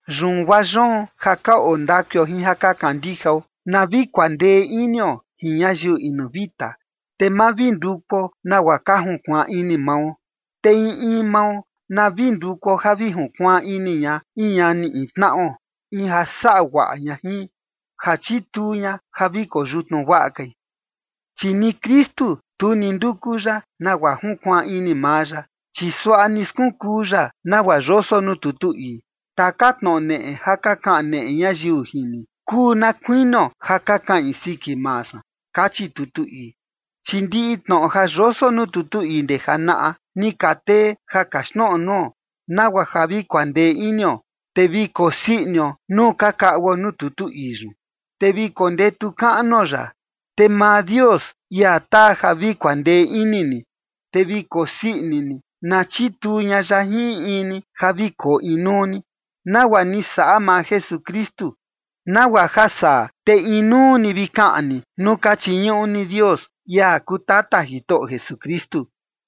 Yun guaa yoon ja ka oo ndakuio jin ja ka kandijao, na vi kuandee inio jin ñayiu inu vita, te ma vi ndukuo nagua ka junkuaan ini mao. Te in in mao na vi ndukuo ja vi junkuaan ini ña in ñani in tnaꞌo, in ja saꞌa guaꞌa ña jin, ja chituu ña ja vi koyutnu guaꞌa kai. Chi ni Kristu, tu ni nduku ya nagua junkuaan ini maa ya, chi suaꞌa ni skunkuu ya nagua yoso nuu tutu ii: “Taka tnoꞌo neꞌe ja ka kaneꞌe ñayiu jin ni, kuu na kuinio ja ka kaꞌin siki maa san”, kachi tutu ii. Chi ndiꞌi tnoꞌo ja yoso nuu tutu ii ndee janaꞌa, ni ka tee ja kaxtnoꞌo nuo, nagua ja vi kuandee inio, te vi kosii inio nuu ka kaꞌuo nuu tutu ii yun, te vi kondetu kaꞌnuo ya. Te maa Dios, ia taa ja vi kuandee ini ni, te vi kosii ini ni, na chituu ña ya jin in in ni ja vi koo inuu ni, nagua ni saꞌa maa Jesukristu, nagua ja saa te inuu ni vi kaꞌan ni, nuu ka chiñuꞌu ni Dios, ia kuu Tata Jitoꞌo Jesukristu.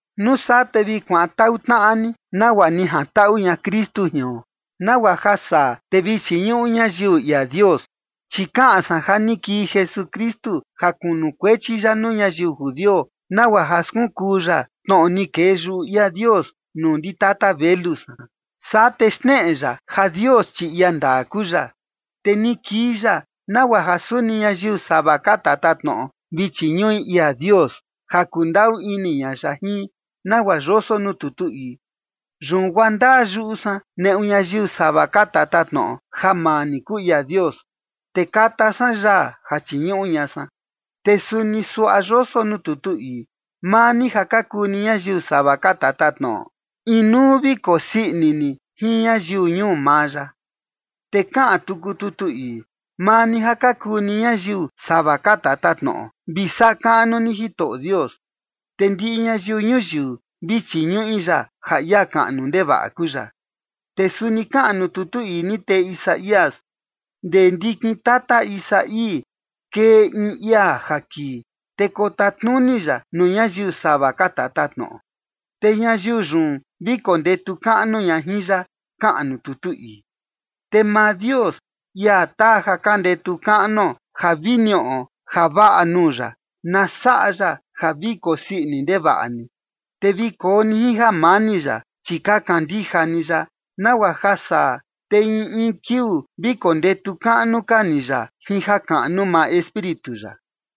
Nuu saa te vi kuantaꞌu tnaꞌa ni, nagua ni jantaꞌu ña Kristu jion, nagua ja saa te vi chiñuꞌu ñayiu ia Dios. Chi kaꞌan san ja ni kii Jesukristu ja kunukuechi ya nuu ñayiu judio nagua ja skunkuu ya tnoꞌo ni kee yuꞌu ia Dios nuu ndi tata velu san, saa te xneꞌe ya ja Dios chi ia ndaa kuu ya. Te ni kii ya, nagua ja suni ñayiu sava ka tatatnoꞌo vi chiñuꞌi ia Dios ja kundaꞌu ini ña ya jin, nagua yoso nuu tutu ii: Yun guaa ndaa yuꞌu san neꞌu ñayiu sava ka tatatnoꞌo ja maa ni kuu ia Dios, te kata san yaa ja chiñuꞌu ña san. Te suni suaꞌa yoso nuu tutu ii: Maa ni ja ka kuu ni ñayiu sava ka tatatnoꞌo, inuu vi kokusii ini ni jin ñayiu ñuu maa ya. Te kaꞌan tuku tutu ii: Maa ni ja ka kuu ni ñayiu sava ka tatatnoꞌo, vi saꞌa kaꞌnu ni Jitoꞌo Dios, te ndiꞌi ñayiu ñuyiu vi chiñuꞌu ya ja ia kaꞌnu ndevaꞌa kuu ya. Te suni kaꞌan nuu tutu ni tee Isaías: Ndee ndikin tata Isaí kee in ia ja kii, te kotatnuni ya nuu ñayiu sava ka tatatnoꞌo, te ñayiu yun, vi kondetu kaꞌnu ña jin ya, kaꞌan nuu tutu ii. Te maa Dios, ia taa ja ka ndetu kaꞌnuo ja vi niꞌo javaꞌa nuu ya, na saꞌa ya ja vi kosii ini ndevaꞌa ni, te vi koo ni jin jamani ya, chi ka kandija ni ya, nagua ja saa te in in kiuu vi kondetu kaꞌnu ka ni ya jin jakaꞌnu maa Espíritu ya.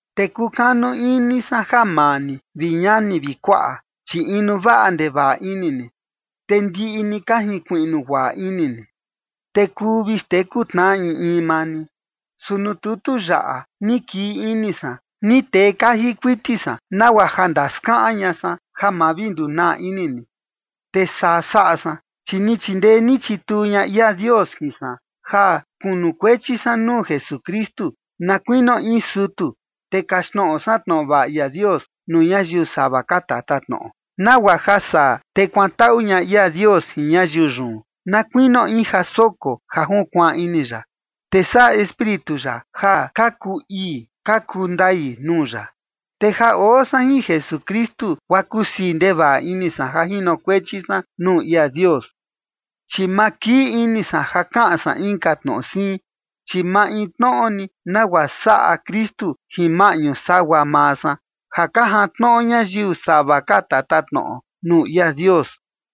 Te kukanu ini san ja maa ni, vi ñani vi kuaꞌa, chi inu vaꞌa ndevaꞌa ini ni, te ndiꞌi ni ka jinkuiꞌnu guaꞌa ini ni, te kuu vi xteku tnaꞌa in in maa ni. Su nuu tutu yaꞌa, ni kii ini san ni tee kaji kuiti san nagua ja ndaskaꞌan ña san, ja ma vi ndunaa ini ni. Te saa saꞌa san, chi ni chindee ni chituu ña ia Dios jin san, ja kunukuechi san nuu Jesukristu na kuinio in sutu, te kaxtnoꞌo san tnoꞌo vaꞌa ia Dios nuu ñayiu sava ka tatatnoꞌo, nagua ja saa te kuantaꞌu ña ia Dios jin ñayiu yun, na kuinio in ja soko ja junkuaan ini ya, te saꞌa Espíritu ya ja ka kuu ii ka kuu ndai nuu ya. Te ja oo san jin Jesukristu guaa kusii ndevaꞌa ini san ja jinokuechi san nuu ia Dios. Chi ma kii ini san ja kaꞌan san inka tnoꞌo siin, chi maintnoꞌo ni nagua saꞌa Kristu jin maꞌñu sagua maa san, ja ka jantnoꞌo ñayiu sava ka tatatnoꞌo nuu ia Dios.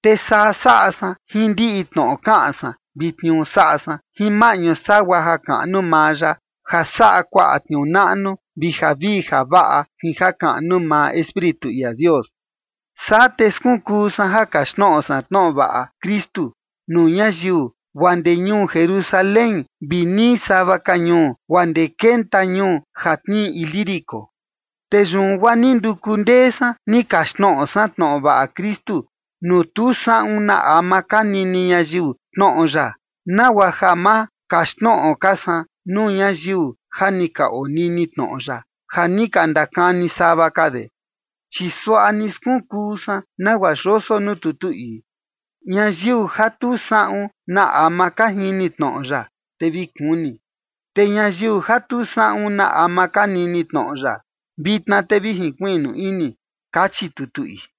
Te saa saꞌa san jin ndiꞌi tnoꞌo kaꞌan san vi tniuu saꞌa san, jin maꞌñu sagua jakaꞌnu maa ya ja saꞌa kuaꞌa tniuu naꞌnu vi javii javaꞌa jin jakaꞌnu maa Espíritu ia Dios. Saa te skunkuu san ja kaxtnoꞌo san tnoꞌo vaꞌa Kristu nuu ñayiu guaa ndee ñuu Jerusalén vi nii sava ka ñuu guaa ndee kenta ñuu ja tnii Ilírico. Te yun guaa ni nduku ndee san ni kaxtnoꞌo san tnoꞌo vaꞌa Kristu nuu tu saꞌun na ama ka nini ñayiu tnoꞌo ya, nagua ja ma kaxtnoꞌo ka san nuu ñayiu ja ni ka onini tnoꞌo ya ja ni ka ndakani sava ka de. Chi suaꞌa ni skunkuu san nagua yoso nuu tutu ii: Ñayiu ja tu saꞌun na ama ka jini tnoꞌo ya, te vi kuni. Te ñayiu ja tu saꞌun na ama ka nini tnoꞌo ya, vitna te vi jinkuiꞌnu ini, kachi tutu ii.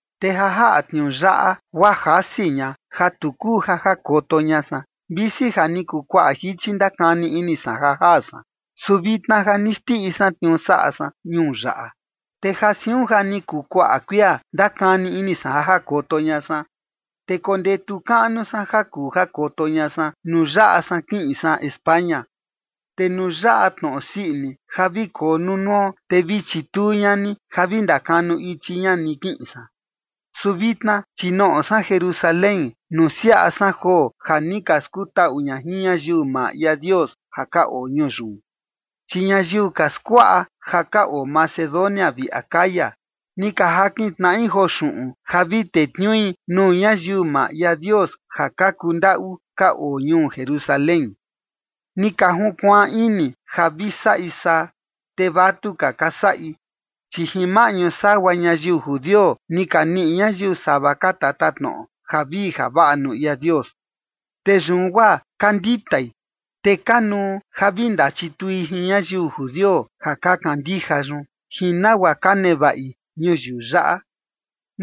Te ja jaꞌa tniuu yaꞌa guaa jasi ña ja tu kuu ja jakoto ña san, visi ja ni kuu kuaꞌa jichi ndakani ini san ja jaa san. Su vitna ja ni xndiꞌi san tniuu saꞌa san ñuu yaꞌa, te ja siun ja ni kuu kuaꞌa kuia ndakani ini san ja jakoto ña san. Te kondetu kaꞌnu san ja kuu jakoto ña san nuu yaꞌa san kiꞌin san España. Te nuu yaꞌa tnoꞌo sii ini ja vi koo nunuo, te vi chituu ña ni ja vi ndakanu ichi ña ni kiꞌin san. Su vitna, chi noꞌo san Jerusalén nusiaꞌa san joo ja ni ka skutaꞌu ña jin ñayiu maa ia Dios ja ka oo ñuu yun. Chi ñayiu ka skuaꞌa ja ka oo Macedonia vi Acaya, ni ka jakin tnaꞌi joo xuꞌun ja vi tetniui nuu ñayiu maa ia Dios ja ka kuu ndaꞌu ka oo ñuu Jerusalén. Ni ka junkuaan ini ja vi saꞌi saa, te vatuka ka saꞌi, chi jin maꞌñu sagua ñayiu judio ni ka niꞌi ñayiu sava ka tatatnoꞌo javii javaꞌa nuu ia Dios. Te yun guaa ka nditai, te kanuu ja vi ndachitui jin ñayiu judio ja ka kandija yun, jin nagua ka nevaꞌi ñuyiu yaꞌa.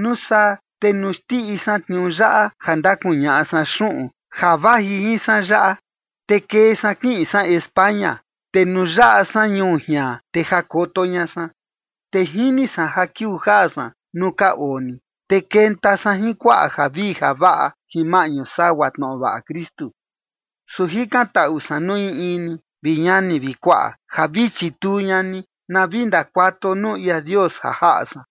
Nuu saa te nuu xndiꞌi san tniuu yaꞌa, ja ndakuñaꞌa san xuꞌun ja vaji jin san yaꞌa, te kee san kiꞌin san España, te nuu yaꞌa san ñuu jian, te jakoto ña san. Te jini san ja kiuu jaa san nuu ka oo ni, te kenta san jin kuaꞌa javii javaꞌa jin maꞌñu sagua tnoꞌo vaꞌa Kristu. Su jikantaꞌu san nuu in in ni, vi ñani vi kuaꞌa, ja vi chituu ña ni na vi ndakuatuo nuu ia Dios ja jaꞌa san,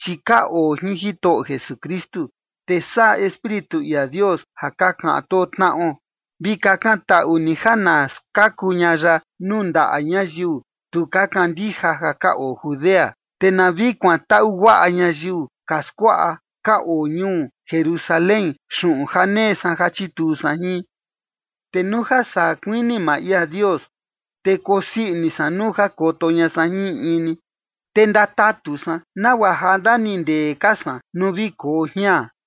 chi ka oo jin Jitoꞌo Jesukristu, te saꞌa Espíritu ia Dios ja ka kaꞌan too tnaꞌo. Vi kakantaꞌu ni ja na skaku ña ya nuu ndaꞌa ñayiu tu ka kandija ja ka oo Judea, te na vi kuantaꞌu guaꞌa ñayiu ka skuaꞌa ka oo ñuu Jerusalén xuꞌun ja nee san ja chituu san jin. Te nuu ja saa kuini maa ia Dios, te kosii ini san nuu jakoto ña san jin in in ni, te ndatatu san nagua ja ndanindee ka san nuu vi koo jian.